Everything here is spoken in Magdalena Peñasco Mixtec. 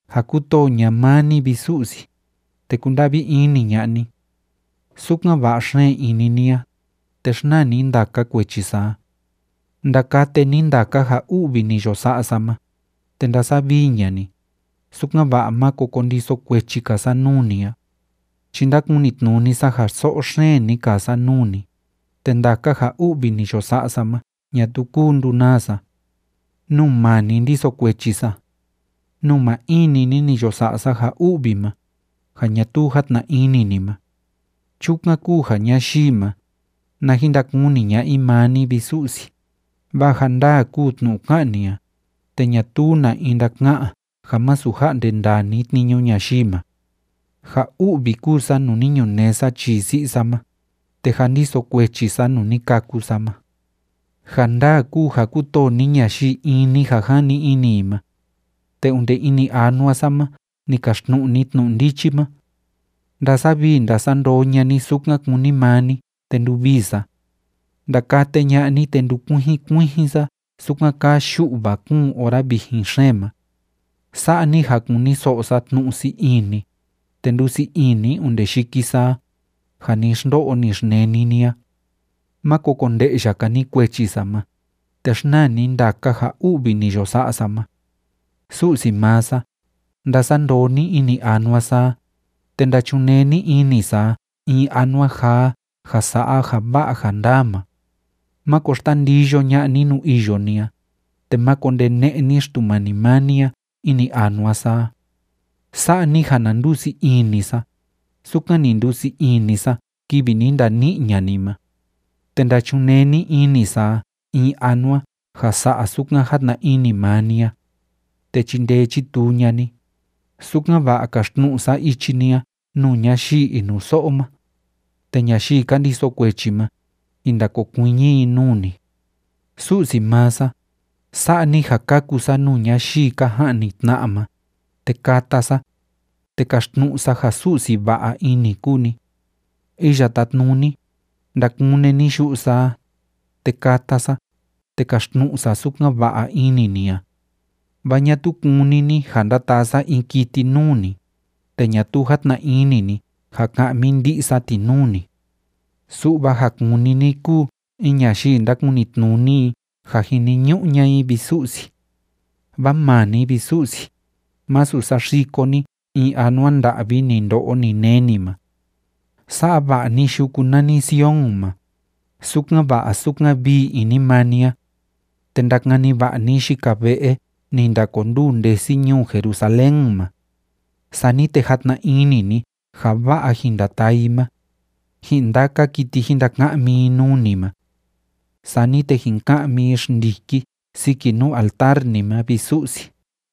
Ja kútoo ña'a maa ni, vi Su'si, te kunda'vi ini ña'a ni. Sukan va'a xeen ini ni a, te xnaa ni ndaka kuechi sa a. Ndakate ni ndaka ja u'vi ni yo sa'a sa ma, te ndasavii ña'a ni, sukan‑va'a máko kondiso kuechi‑ka sa nuu ni a, chi ndakunitnuni sa ja so'o xeen ni kaa sa nuu ni, te ndaka ja u'vi ni yo sa'a sa ma ñatuu kúu ndunaa sa. Nuu maa ni, ndiso kuechi sa. Nuu maa in‑ni ni, ni yo sa'a sa ja u'vi ma, ja ñatuu játna ini ni ma. Chukan kúu ja ñayii ma, na jin ndakuni ña'a i maa ni, vi Su'si, vaa ja ndaa kúu tnu'u ká'an ni a, te ñatuu na in ndaka'an ja masu ja'nde ndaa ni tniñu ñayii ma. Ja u'vi kúu sa, nuu ni ñunee sa chii si'i sa ma, te jâ ndiso kuechi sa nuu ni kâku sa ma. Ja ndaa kúu ja kútoo ni ñayii in‑ni ja jani ini i ma, te onde ini anua sa ma ni kaxtnu'u ni tnu'u ndichi ma. Ndasavii ndasandoo ña'a ni sukan kúni maa ni, te nduvii sa. Ndakate ña'a ni, te ndukuijin kuijin sa sukan kaa yu'va kúun ora vijin xeen ma. Sa'a ni ja kuniso'o sa tnu'u sii ini, te ndúsii ini onde yiki sa a, ja ni xndo'o ni xneni ni a. Máko konde'ya‑ka ni kuechi sa ma, te xnaa ni ndaka ja u'vi ni yo sa'a sa ma. Su'si maa sa, ndasandoo ni ini anua sa a, te ndachunee ni ini sa a in anua jaa ja sa'a ja va'a ja ndaa ma. Máko xtandiyo ña'a ni nuu iyo ni a, te máko ndene'e ni Xtumani maa ni a ini anua sa a. Sa'a ni ja na ndusii ini sa, sukan ni ndusii ini sa kivi ni ndani'i ña'a ni ma. Te ndachunee ni ini sa a in anua ja sa'a sukan játna ini maa ni a, te chindee chituu ña'a i, sukan‑va'a kaxtnu'u sa ichi ni a nuu ñayii inuso'o ma, te ñayii ka ndiso kuechi ma, jin ndakokuiñi i nuu ni. Su'si maa sa, sa'a ni ja kaku sa nuu ñayii ka ja'ni tna'a ma, te kata sa, te kaxtnu'u sa ja Su'si va'a ini kúu ni. Iya Tátnuni, ndakune ni yu'u sa a, te kata sa, te kaxtnu'u sa sukan va'a ini ni a. Vaa ñatuu kúni ni ja ndataa sa in kiti nuu ni, te ñatuu játna ini ni ja ka'mi ndi'i sa ti nuu ni. Su'va ja kúni ni kúu in ñayii ndákunitnuni i ja jiniñu'u ña'a i, vi Su'si. Vaa maa ni, vi Su'si, masu saxiko ni in anua nda'vi ni ndo'o ni neni ma. Sa'a va'a ni yuku nani Sion ma, sukan va'a sukan vii ini maa ni a. Te ndakani va'a ni yika ve'e ni ndakonduu ndesi ñuu Jerusalén ma. Sani te jatna ini ni ja va'a jin ndataa i ma, ji'in ndaka kiti jin ndaka'mi i nuu ni ma. Sani te jin ka'mi i xndiki siki nuu altar ni ma, vi Su'si.